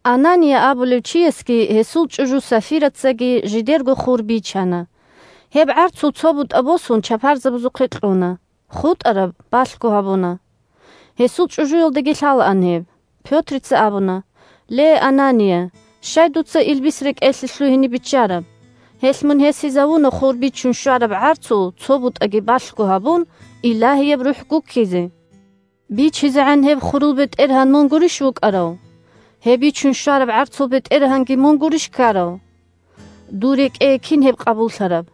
Анания абулев чиясги гьесул чӀужу Сафирацаги жидерго хур бичана. Гьеб гӀарцул цо бутӀа босун чапарзабазухъе кьуна, хутӀараб балъго гьабуна. (Гьесул чӀужуялдаги лъалаан гьеб.) Пётрица абуна: – Ле, Анания, щай дуца илбис рекӀелъе лъугьине биччараб? Гьелъ мун гьесизавуна, хур бичун щвараб гӀарцул цо бутӀаги балъго гьабун, Илагьияб РухӀ гуккизе. БичизегӀан гьеб хурул бетӀергьан мун гурищ вукӀарав? Гьеб бичун щвараб гӀарцул бетӀергьанги мун гурищ ккарав? Дур рекӀее кин гьеб къабуллъараб?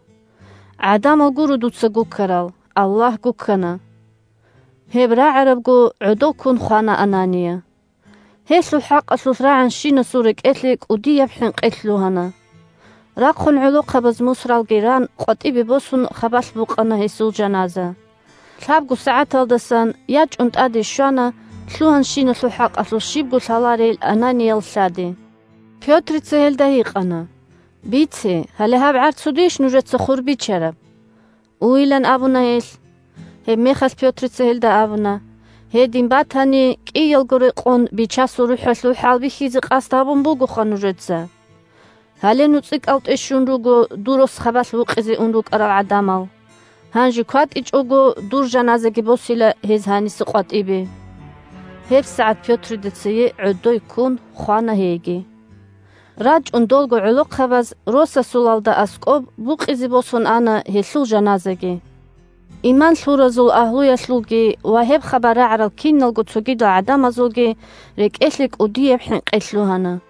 ГӀадамал гуро дуца гуккарал, Аллагь гуккана. Гьеб рагӀарабго гӀодов ккун хвана Анания. Гьелъул хӀакъалъулъ рагӀанщинасул рекӀелъе кӀудияб хӀинкъи лъугьана. Рахъун гӀолохъабаз мусралги ран, къватӀибе босун, хабалъ букъана гьесул жаназа. Лъабго сагӀаталдасан ячӀун тӀаде щвана лъугьанщиналъул хӀакъалъулъ щибго лъаларей Ананиял лъади. Пётрица гьелда гьикъана: – Бице, гьале гьаб гӀарцудейищ нужеца хур бичараб? Уйилан абуна гьелъ. Гьебмехалъ Пётрица гьелда абуна: – Гьедин батани кӀиялго рекъон Бичасулаб РухӀалъул хӀалбихьизе къасд гьабун бугоха нужеца. Гьале нуцӀикӀалтӀе щун руго дур рос хабалъ вукъизе ун рукӀарал гӀадамал. Гьанже кватӀичӀого дур жаназаги босила гьез гьаниса къватӀибе. ГьебсагӀат Пётрида цее гӀодой ккун хвана гьейги. РачӀун долго гӀолохъабаз росасулалда аскӀоб букъизе босун ана гьелъул жаназаги. Иман лъуразул агьлуялъулги ва гьеб хабар рагӀарал киналго цогидал гӀадамазулги рекӀелъе кӀудияб хӀинкъи лъугьана.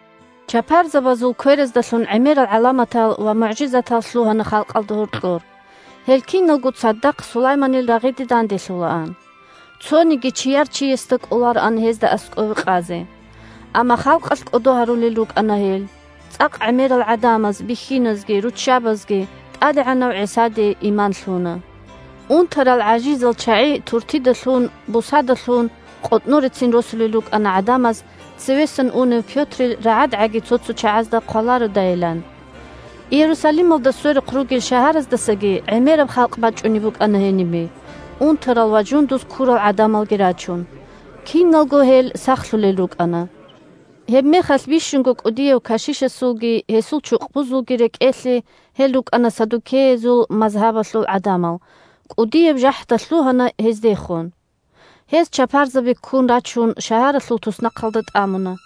Чапарзабазул квераздалъун гӀемерал гӀаламатал ва мугӀжизатал лъугьана халкъалда гьоркьор. Гьел киналго цадахъ Сулайманил рагъиде данделъулаан. Цониги чияр чиясда кӀолароан гьезда аскӀове къазе. Амма халкъалъ кӀодо гьарулел рукӀана гьел. ЦӀакъ гӀемерал гӀадамаз – бихьиназги руччабазги – ТӀадегӀанав ГӀисаде иман лъуна. Унтарал-гӀажизал чагӀи туртида лъун, бусада лъун къотӀнорецин росулел рукӀана гӀадамаз цевесан унев Пётрил рагӀадгӀаги цо-цо чагӀазда хъвалародайилан. Иерусалималда сверухъ ругел шагьараздасаги гӀемераб халкъ бачӀунеб букӀана гьенибе, унтарал ва жундуз ккурал гӀадамалги рачун. Киналго гьел сахлъулел рукӀана. Гьебмехалъ бищунго кӀудияв кашишасулги гьесул чукъбузулги рекӀелъе (гьел рукӀана саддукеязул мазгьабалъул гӀадамал) кӀудияб жахӀда лъугьана гьездехун. Гьез чапарзаби ккун рачун шагьаралъул туснахъалда тӀамуна.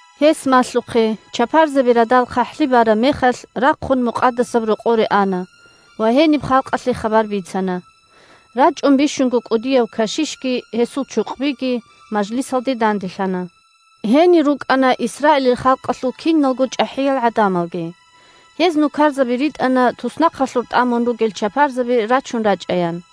Гьес малъухъе чапарзаби радал хъахӀлъи бараб мехалъ рахъун Мукъадасаб Рокъоре ана ва гьениб халкъалъе хабар бицана. РачӀун бищунго кӀудияв кашишги гьесул чукъбиги мажлисалде данделъана. Гьенир рукӀана Исраилил халкъалъул киналго чӀахӀиял гӀадамалги. Гьез нукарзаби ритӀана туснахъалъур тӀамун ругел чапарзаби рачун рачӀаян.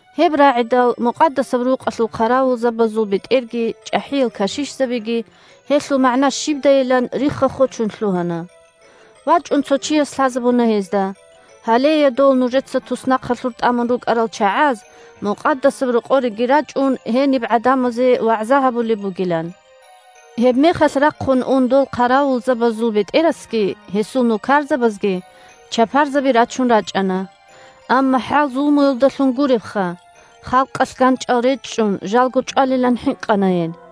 Гьеб рагӀидал, Мукъадасаб Рукъалъул хъаравулзабазул бетӀерги чӀахӀиял кашишзабиги, гьелъул магӀна щибдайилан, рихха-хочун лъугьана. ВачӀун цо чияс лъазабуна гьезда, гьалея, дол нужеца туснахъалъур тӀамун рукӀарал чагӀаз, Мукъадасаб Рокъореги рачӀун, гьениб гӀадамазе вагӀза гьабулеб бугилан. Гьебмехалъ рахъун ун дол хъаравулзабазул бетӀерасги гьесул нукарзабазги чапарзаби рачун рачӀана. Амма хӀал-зулмуялдалъун гуребха, – халкъалъ ганчӀал речӀчӀун жалго чӀвалилан хӀинкъана гьел.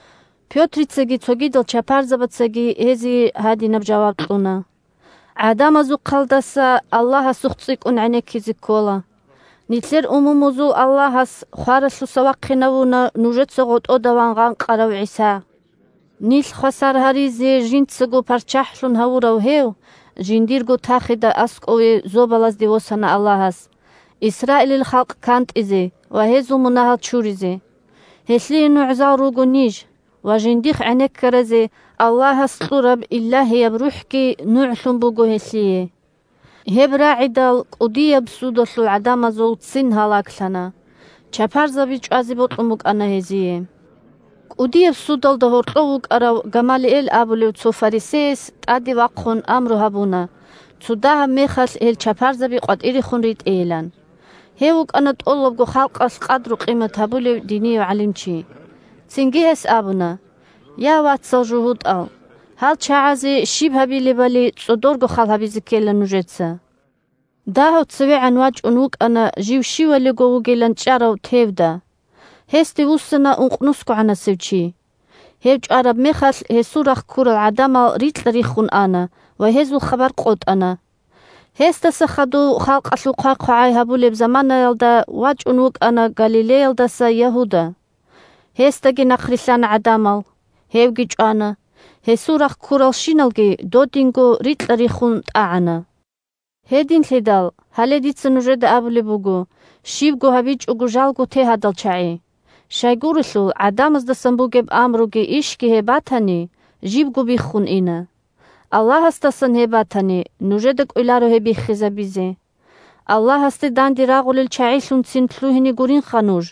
Пётрицаги цогидал чапарзабацаги гьезие гьадинаб жаваб кьуна: – ГӀадамазухъалдаса Аллагьасухъ цӀикӀкӀун гӀенеккизе ккола. Нилъер умумузул Аллагьас хваралъуса вахъинавуна нужеца гъотӀода ван гъанкъарав ГӀиса. Нилъ хвасар гьаризе жинцаго ПарччахӀлъун гьавурав гьев жиндирго тахида аскӀове зобалазде восана Аллагьас, Исраилил халкъ кантӀизе ва гьезул мунагьал чуризе. Гьелъие нугӀзал руго ниж ва жиндихъ гӀенеккаразе Аллагьас кьураб Илагьияб РухӀги нугӀлъун буго гьелъие. Гьеб рагӀидал, кӀудияб судалъул гӀадамазул ццин гьалаглъана. Чапарзаби чӀвазе бокьун букӀана гьезие. КӀудияб судалда гьоркьов вукӀарав Гамалиэл абулев цо фарисеяс тӀаде вахъун амру гьабуна цо дагьаб мехалъ гьел чапарзаби къватӀирехун ритӀейилан. Гьев вукӀана тӀолабго халкъалъ къадру-къимат гьабулев динияв гӀалимчи. Цинги гьес абуна: – Я, вацал-жугьутӀал! Гьал чагӀазе щиб гьабилебали цӀодорго хал гьабизе ккела нужеца. Дагьав цевегӀан вачӀун вукӀана жив щивалиго вугилан чӀарав Тевда. Гьесде вуссана ункънусгогӀанасев чи. Гьев чӀвараб мехалъ гьесул рахъ ккурал гӀадамал рикьа-риххун ана ва гьезул хабар къотӀана. Гьесдаса хадув халкъалъул хъвай-хъвагӀай гьабулеб заманаялда вачӀун вукӀана Галилеялдаса Ягьуда. Гьесдаги нахърилълъана гӀадамал. Гьевги чӀвана, гьесул рахъ ккуралщиналги додинго рикьа-риххун ун тӀагӀана. Гьединлъидал, гьале дица нужеда абулеб буго, щибго гьабичӀого жалго те гьадал чагӀи. Щайгурелъул гӀадамаздасан бугеб амруги ишги гьеб батани, жибго биххун ина. Аллагьасдасан гьеб батани, нужеда кӀвеларо гьеб биххизабизе. Аллагьасда данде рагъулел чагӀилъунцин лъугьине гуринха нуж.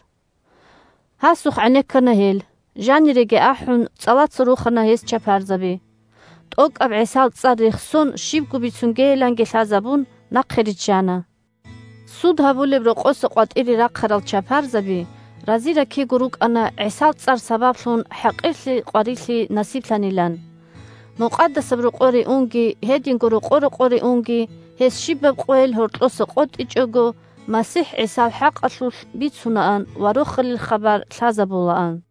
Гьасухъ гӀенеккана гьел. Жаниреги ахӀун, цӀалаца рухана гьез чапарзаби. ТӀокӀаб ГӀисал цӀар рехсон щибго бицунгейиланги лъазабун, нахъе риччана. Суд гьабулеб рокъоса къватӀире рахъарал чапарзаби рази-ракиго рукӀана ГӀисал цӀар сабаблъун хӀакъирлъи-къварилъи насиблъанилан. Мукъадасаб Рокъоре унги, гьединго рокъо-рокъоре унги, гьез щибаб къойил гьоркьоса къотӀичӀого МасихӀ ГӀисал хӀакъалъулъ бицунаан ва Рохалил хабар лъазабулаан.